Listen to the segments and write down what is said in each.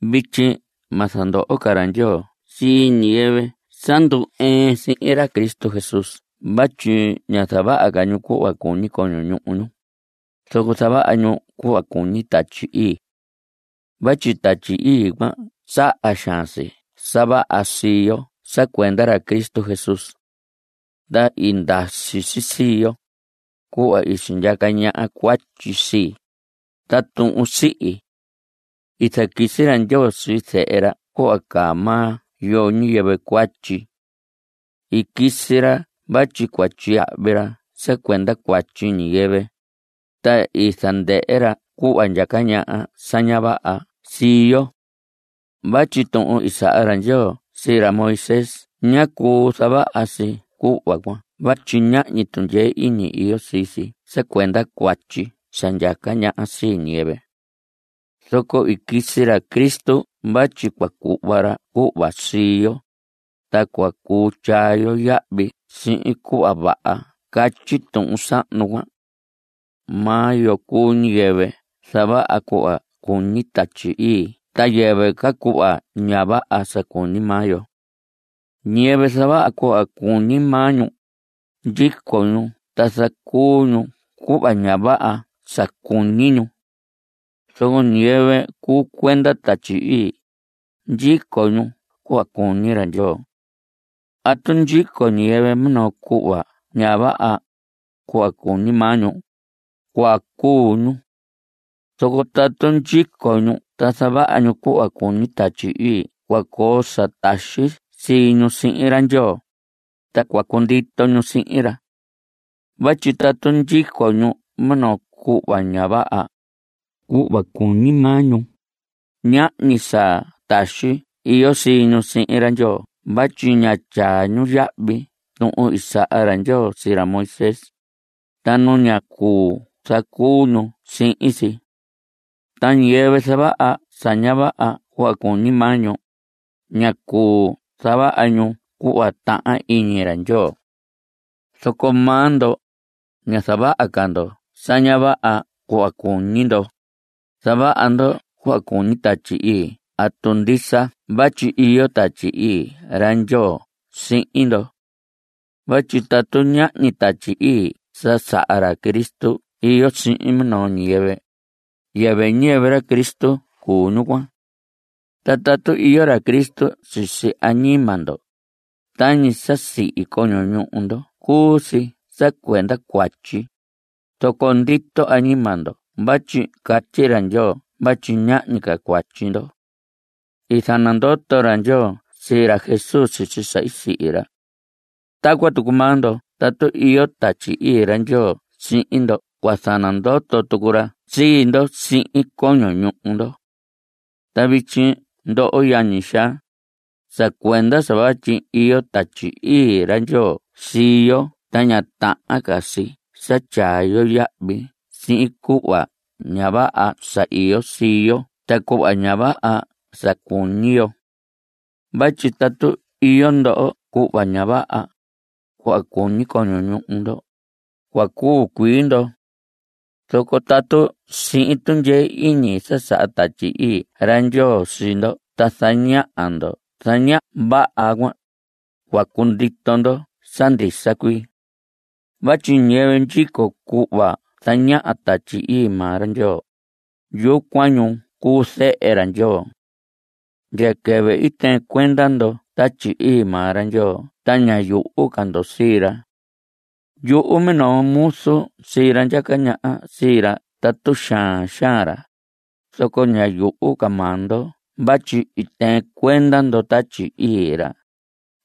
Vityi ma zandoho ca ra Ndyoo sii ñiyɨvɨ sa ndu‑ɨɨn sihin ra Cristo Jesús vatyi ña zavaha ca ñu cuhva cuñi coño ñuhu ñu, zoco zavaha ñu cuhva cuñi Tatyi Ii. Vatyi Tatyi Ii cuan saha xaan si sa vaha sii yo sa cuenda ra Cristo Jesús. Ta i ndasi si sii, cuhva i sindyaca ñaha cuatyi sii, ta tuhun sihi. I zaquisi ra Ndyoo sii Zehe ra cuhva caa maa yo ñiyɨvɨ cuatyi. I quisi ra vatyi cua tyiyahvi ra sa cuenda cuatyi ñiyɨvɨ, ta i zandɨhɨ ra cuhva ndyaca ñaha sa ña vaha sii yo. Vatyi tuhun i saha ra Ndyoo sii ra Moisés ñá cuu zavaha si cuhva cuan vatyi ñahñi tundyee iñi iyo sii si sa cuenda cuatyi sa ndyaca ñaha sii ñiyɨvɨ. Zoco i quisi ra Cristo vatyi cua cuhva ra cuhva sii yo, ta cua cuu tyaa yo yahvi sii cuhva vaha sa catyi tuhun sahnu cuan. Maa yo cuu ñiyɨvɨ zavaha cuhva cuñi Tatyi Ii ta yɨvɨ ca cuhva ña vaha sa cuñi maa yo. Ñiyɨvɨ zavaha cuhva cuñi maa ñu, ndyico ñu ta zacuu ñu cuhva ña vaha sa cuñi ñu. Zoco ñiyɨvɨ cuu cuenda Tatyi Ii, ndyico ñu cuhva cuñi ra Ndyoo. Tatu ndyico ñiyɨvɨ minoo cuhva ña vaha, cuhva cuñi maa ñu, cua cuu ñu. Zoco tatu ndyico ñu ta zavaha ñu cuhva cuñi Tatyi Ii cua coo sa taxi sii ñu sihin ra Ndyoo, ta cua cundito ñu sihin ra. Vatyi tatu ndyico ñu minoo cuhva ña vaha, cuhva cuñi maa ñu, ñahñi sa taxi iyo sii ñu sihin ra Ndyoo vatyi ña tyaa ñu yahvi tuhun i saha ra Ndyoo sii ra Moisés, ta nu ña cuu zacuu ñu sihin si. Ta ñiyɨvɨ zavaha sa ña vaha cuhva cuñi maa ñu, ña cuu zavaha ñu cuhva tahan iñi ra Ndyoo. Zoco maa ndo, ña zavaha ca ndo sa ña vaha cuhva cuñi ndo, zavaha ndo cuhva cuñi Tatyi Ii tatu ndisa vatyi iyo Tatyi Ii ra Ndyoo sihin ndo. Vatyi tatu ñahñi Tatyi Ii sa saha ra Cristo iyo sihin minoo ñiyɨvɨ, yɨvɨ ñiyɨvɨ ra Cristo cuu ñu cuan. Ta tatu iyo ra Cristo sisi añima ndo, tañi sa sihi coño ñuhu ndo cuu si sa cuenda cuatyi, zoco ndito añima ndo vatyi catyi ra Ndyoo vatyi ñahñi ca cuatyi ndo. I zanandoto ra Ndyoo sii ra Jesús sisi sa i sihi ra. Ta tacuan tucu maa ndo tatu iyo Tatyi Ii ra Ndyoo sihin ndo cua zanandoto tucu ra sii ndo sihin coño ñuhu ndo. Ta vityi ndoho yañi xaa, sa cuenda sa vatyi iyo Tatyi Ii ra Ndyoo sii yo ta ña tahan ca si sa tyaa yo yahvi sii cuhva ña vaha sa iyo sii yo ta cuhva ña vaha sa cuñi yo. Vatyi tatu iyo ndo cuhva ña vaha, cuhva cuñi coño ñuhu ndo, cua cuu cuii ndo. Zoco tatu sihin tundyee iñi sa saha Tatyi Ii ra Ndyoo sii ndo ta zaña ndo sa ña vaha cuan, cua cundito ndo sa ndisa cuii. Vatyi ñiyɨvɨ ndyico cuhva zañaha Tatyi Ii maa ra Ndyoo, yucuan ñu cuu zehe ra Ndyoo. Ndya quɨvɨ i tɨɨn cuenda ndo Tatyi Ii maa ra Ndyoo ta ña yuhu ca ndo sii ra. Yuhu minoo muzu sii ra ndyaca ñaha sii ra tatu xaan xaan ra, zoco ña yuhu ca maa ndo vatyi i tɨɨn cuenda ndo Tatyi Ii ra,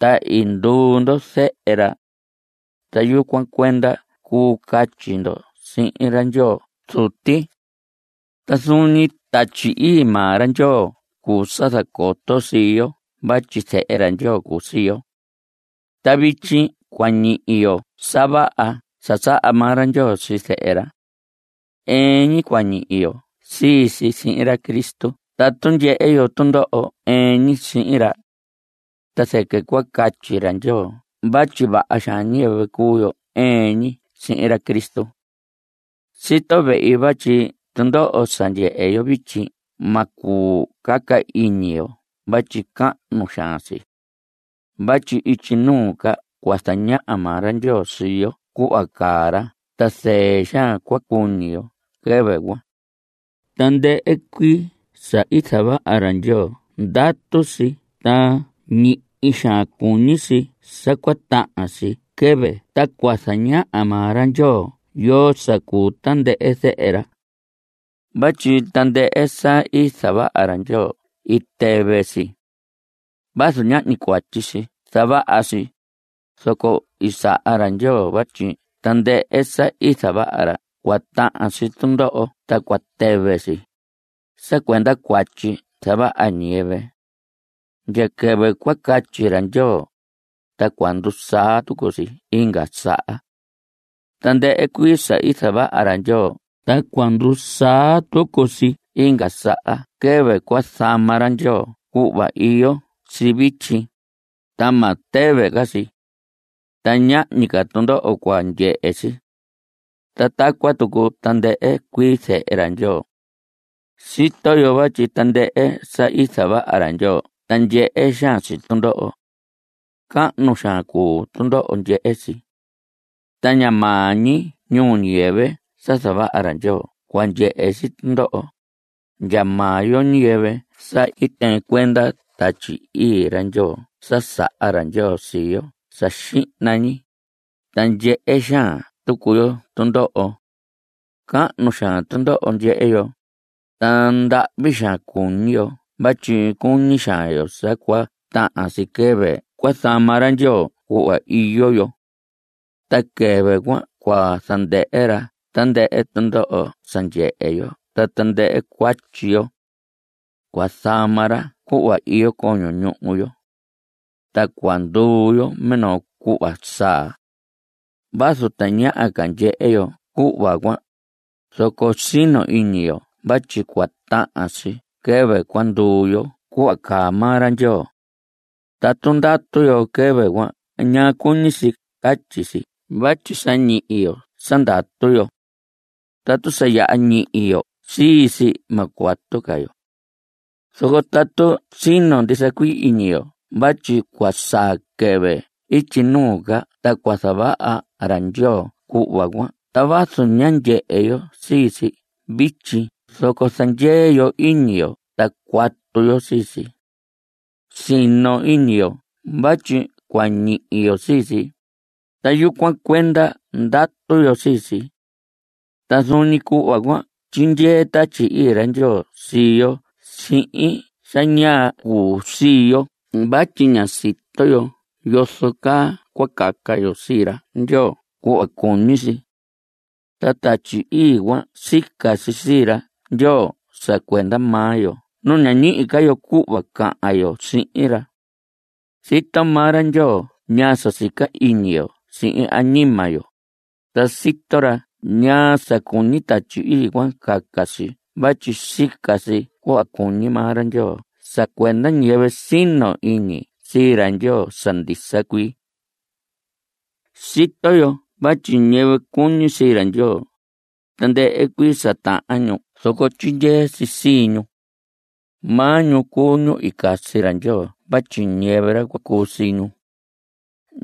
ta i nduu ndo zehe ra. Ta yucuan cuenda cuu catyi ndo sihin ra: “¡Ndyoo Zuti!” Ta zuun ñi Tatyi Ii maa ra Ndyoo cuu sa zacoto sii yo vatyi zehe ra Ndyoo cuu sii yo. Ta vityi cua ñihi yo sa vaha sa saha maa ra Ndyoo sii zehe ra. Ɨɨn ñi cua ñihi yo sii si sihin ra Cristo tatu ndyehe yo tundoho ɨɨn ñi sihin ra. Ta zɨquɨ cua catyi ra Ndyoo vatyi vaha xaan ñiyɨvɨ cuu yo ɨɨn ñi sihin ra Cristo. Sito vehi vatyi tundoho sa ndyehe yo vityi ma cuu caca iñi yo vatyi cahnu xaan si. Vatyi ityi nuu ca cua zañaha maa ra Ndyoo sii yo cuhva caa ra ta zɨɨ xaan cua cuñi yo quɨvɨ cuan. Tandɨhɨ cuii sa i zavaha ra Ndyoo ndatu si ta ñihi xaan cuñi si sa cua tahan si quɨvɨ ta cua zañaha maa ra Ndyoo yoo sa cuu tandɨhɨ zehe ra. Vatyi tandɨhɨ sa i zavaha ra Ndyoo i tɨvɨ si. Vazu ñahñi cuatyi i zavaha si, zoco i saha ra Ndyoo vatyi tandɨhɨ sa i zavaha ra cua tahan si tundoho ta cua tɨvɨ si (sa cuenda cuatyi sa zavaha ñiyɨvɨ). Ndya quɨvɨ cua catyi ra Ndyoo, ta cua ndusaa tucu si inga saha. Tandɨhɨ cuii sa i zavaha ra Ndyoo ta cua ndusaa tucu si inga saha quɨvɨ cua zama ra Ndyoo cuhva iyo si vityi, ta ma tɨvɨ ca si. Ta ñahñi ca tundoho cua ndyehe si. Ta tacuan tucu tandɨhɨ cuii zehe ra Ndyoo. Sito yo vatyi tandɨhɨ sa i zavaha ra Ndyoo ta ndyehe xaan si tundoho. Cahnu xaan cuu tundoho ndyehe si. Ta ña maa ñi ñuu ñiyɨvɨ sa zavaha ra Ndyoo cua ndyehe si tundoho, ndya maa yo ñiyɨvɨ sa i tɨɨn cuenda Tatyi Ii ra Ndyoo sa saha ra Ndyoo sii yo sa xihna ñi, ta ndyehe xaan tucu yo tundoho. Cahnu xaan tundoho ndyehe yo, ta ndahvi xaan cuñi yo vatyi cuñi xaan yo sa cua tahan si quɨvɨ cua zama ra Ndyoo cuhva iyo yo. Ta quɨvɨ cuan cua zandɨhɨ ra tandɨhɨ tundoho sa ndyehe yo ta tandɨhɨ cuatyi yo. Cua zama ra cuhva iyo coño ñuhu yo. Ta cua nduu yo minoo cuhva saa. Vazu tañaha ca ndyehe yo cuhva cuan, zoco sino iñi yo vatyi cua tahan si quɨvɨ cua nduu yo cuhva caa maa ra Ndyoo. Tatu ndatu yo quɨvɨ cuan ña cuñi si catyi si vatyi sa ñihi yo sa ndatu yo. Tatu sa yaha ñihi yo sii si, ma cuatu ca yo. Zoco tatu sino ndisa cuii iñi yo vatyi cua saa quɨvɨ ityi nuu ca ta cua zavaha ra Ndyoo cuhva cuan ta vazu ña ndyehe yo sii si vityi zoco zandyee yo iñi yo ta cuatu yo sii si. (Sino iñi yo vatyi cua ñihi yo sii si, ta yucuan cuenda ndatu yo sii si.) Ta zuun ñi cuhva cuan tyindyee Tatyi Ii ra Ndyoo sii yo sihin sa ña cuu sii yo vatyi ña sito yo yozo caa cua caca yo sii ra Ndyoo cuhva cuñi si. Ta Tatyi Ii cuan sica si sii ra Ndyoo sa cuenda maa yo nu ña ñihi ca yo cuhva cahan yo sihin ra. Sito maa ra Ndyoo ñaa sa sica iñi yo sihin añima yo, ta sito ra ñaa sa cuñi Tatyi Ii cuan caca si vatyi sica si cuhva cuñi maa ra Ndyoo sa cuenda ñiyɨvɨ sino iñi sii ra Ndyoo sa ndisa cuii. Sito yo vatyi ñiyɨvɨ cuñi sii ra Ndyoo, tandɨhɨ cuii sa tahan ñu zoco tyindyee si sii ñu. Maa ñu cuu ñu i casi ra Ndyoo vatyi ñiyɨvɨ ra cua cuu sii ñu.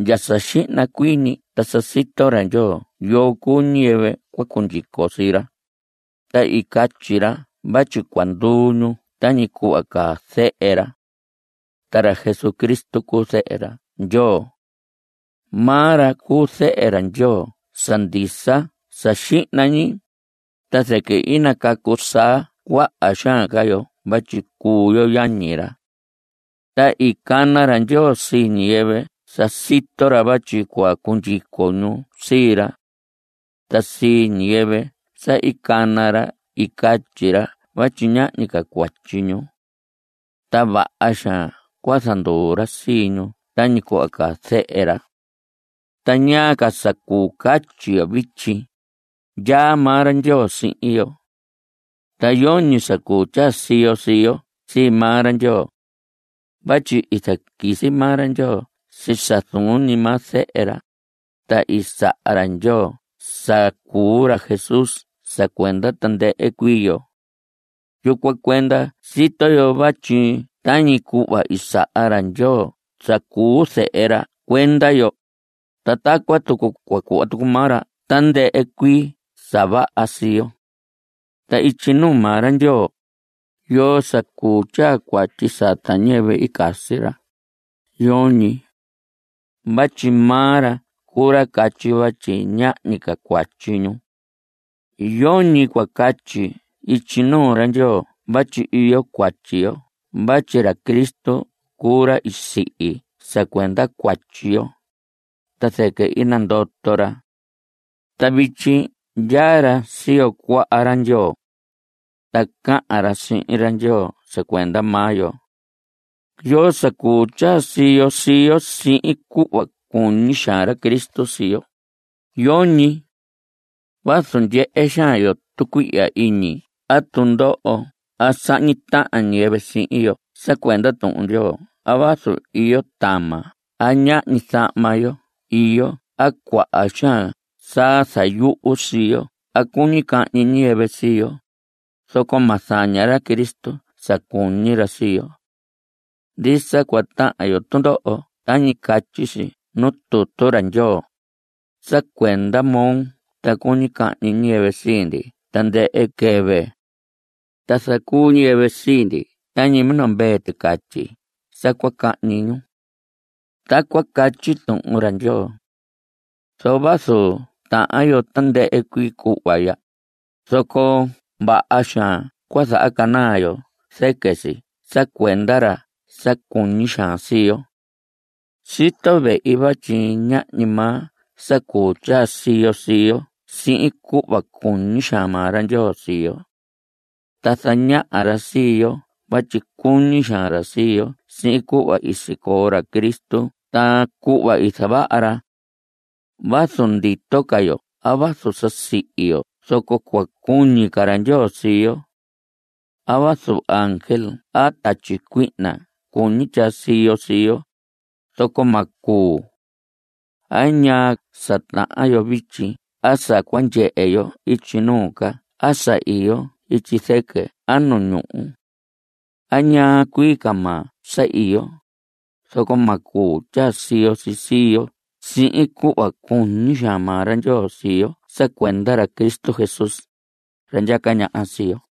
Ndya sa xihna cuii ñi ta sa sito ra Ndyoo yoo cuu ñiyɨvɨ cua cundyico sii ra, ta i catyi ra vatyi cua nduu ñu tañi cuhva caa Zehe ra. Ta ra Jesucristo cuu Zehe ra Ndyoo. Maa ra cuu Zehe Ndyoo sa ndisa sa xihna ñi, ta zɨquɨ i nacacu saa cuaha xaan ca yo vatyi cuu yo yañi ra. Ta i cana ra Ndyoo sii ñiyɨvɨ sa sito ra vatyi cua cundyico ñu sii ra. Ta sii ñiyɨvɨ sa i cana ra i catyi ra vatyi ñahñi ca cuatyi ñu. Ta vaha xaan cua zanduu ra sii ñu tañi cuhva caa Zehe ra. ¿Ta ñaa ca sa cuu catyi yo vityi? Ndyaa maa ra Ndyoo sihin yo. Ta yoñi sa cuu tyaa siyo sii yo sii maa ra Ndyoo. Vatyi i zaquisi maa ra Ndyoo sii sa zuun ñi maa Zehe ra, ta i saha ra Ndyoo sa cuu ra Jesús sa cuenda tandɨhɨ cuii yo. Yucuan cuenda sito yo vatyi tañi cuhva i saha ra Ndyoo sa cuu Zehe ra cuenda yo, ta tacuan tucu cua cuhva tucu maa ra tandɨhɨ cuii ca sa vaha sii yo. Ta ityi nuu maa ra Ndyoo ¿yoo sa cuu tyaa cuatyi sata ñiyɨvɨ i casi ra? Yoñi. Vatyi maa ra cuu ra catyi vatyi ñahñi ca cuatyi ñu. Yoñi cua catyi ityi nuu ra Ndyoo vatyi iyo cuatyi yo vatyi ra Cristo cuu ra i sihi sa cuenda cuatyi yo, ta zɨquɨ i nandoto ra. Ta vityi ndyaa ra siyo cuaha ra Ndyoo. Ta cahan ra sihin ra Ndyoo sa cuenda maa yo. ¿Yoo sa cuu tyaa siyo sii yo sihin cuhva cuñi xaan ra Cristo sii yo? Yoñi. Vazu ndyehe xaan yo tucuihya iñi a tundoho a sahñi tahan ñiyɨvɨ sihin yo sa cuenda Tuhun Ndyoo a vazu iyo tama a ñahñi zahma yo iyo a cuaha xaan sa zayuhu sii yo a cuñi cahñi ñiyɨvɨ sii yo, zoco ma zaña ra Cristo sa cuñi ra sii yo. Ndisa cua tahan yo tundoho tañi catyi si nuu tutu ra Ndyoo: Sa cuenda moo ta cuñi cahñi ñiyɨvɨ sii ndi tandɨhɨ quɨvɨ. Ta zacuu ñiyɨvɨ sii ndi tañi minoo mvee ticatyi sa cua cahñi ñu. Tacuan catyi Tuhun ra Ndyoo. Zoco vazu tahan yo tandɨhɨ cuii cuhva ya, zoco vaha xaan cua zahacanaa yo zɨquɨ si sa cuenda ra sa cuñi xaan sii yo. Sito vehi vatyi ñahñi maa sa cuu tyaa siyo sii yo sihin cuhva cuñi xaan maa ra Ndyoo sii yo. Ta zañaha ra sii yo vatyi cuñi xaan ra sii yo sihin cuhva i sicoo ra Cristo ta cuhva i zavaha ra. Vazu ndito ca yo a vazu sa sihi yo zoco cua cuñi ca ra Ndyoo sii yo. A vazu ángel a tatyi cuihna cuñi tyaa siyo sii yo, zoco ma cuu. A ñaa sa tahan yo vityi a sa cua ndyehe yo ityi nuu ca a sa iyo ityi zɨquɨ a nu ñuhu. A ñaa cuii ca maa sa iyo, zoco ma cuu tyaa siyo si sii yo sihin cuhva cuñi xaan maa ra Ndyoo sii yo sa cuenda ra Cristo Jesús, ra ndyaca ñaha sii yo.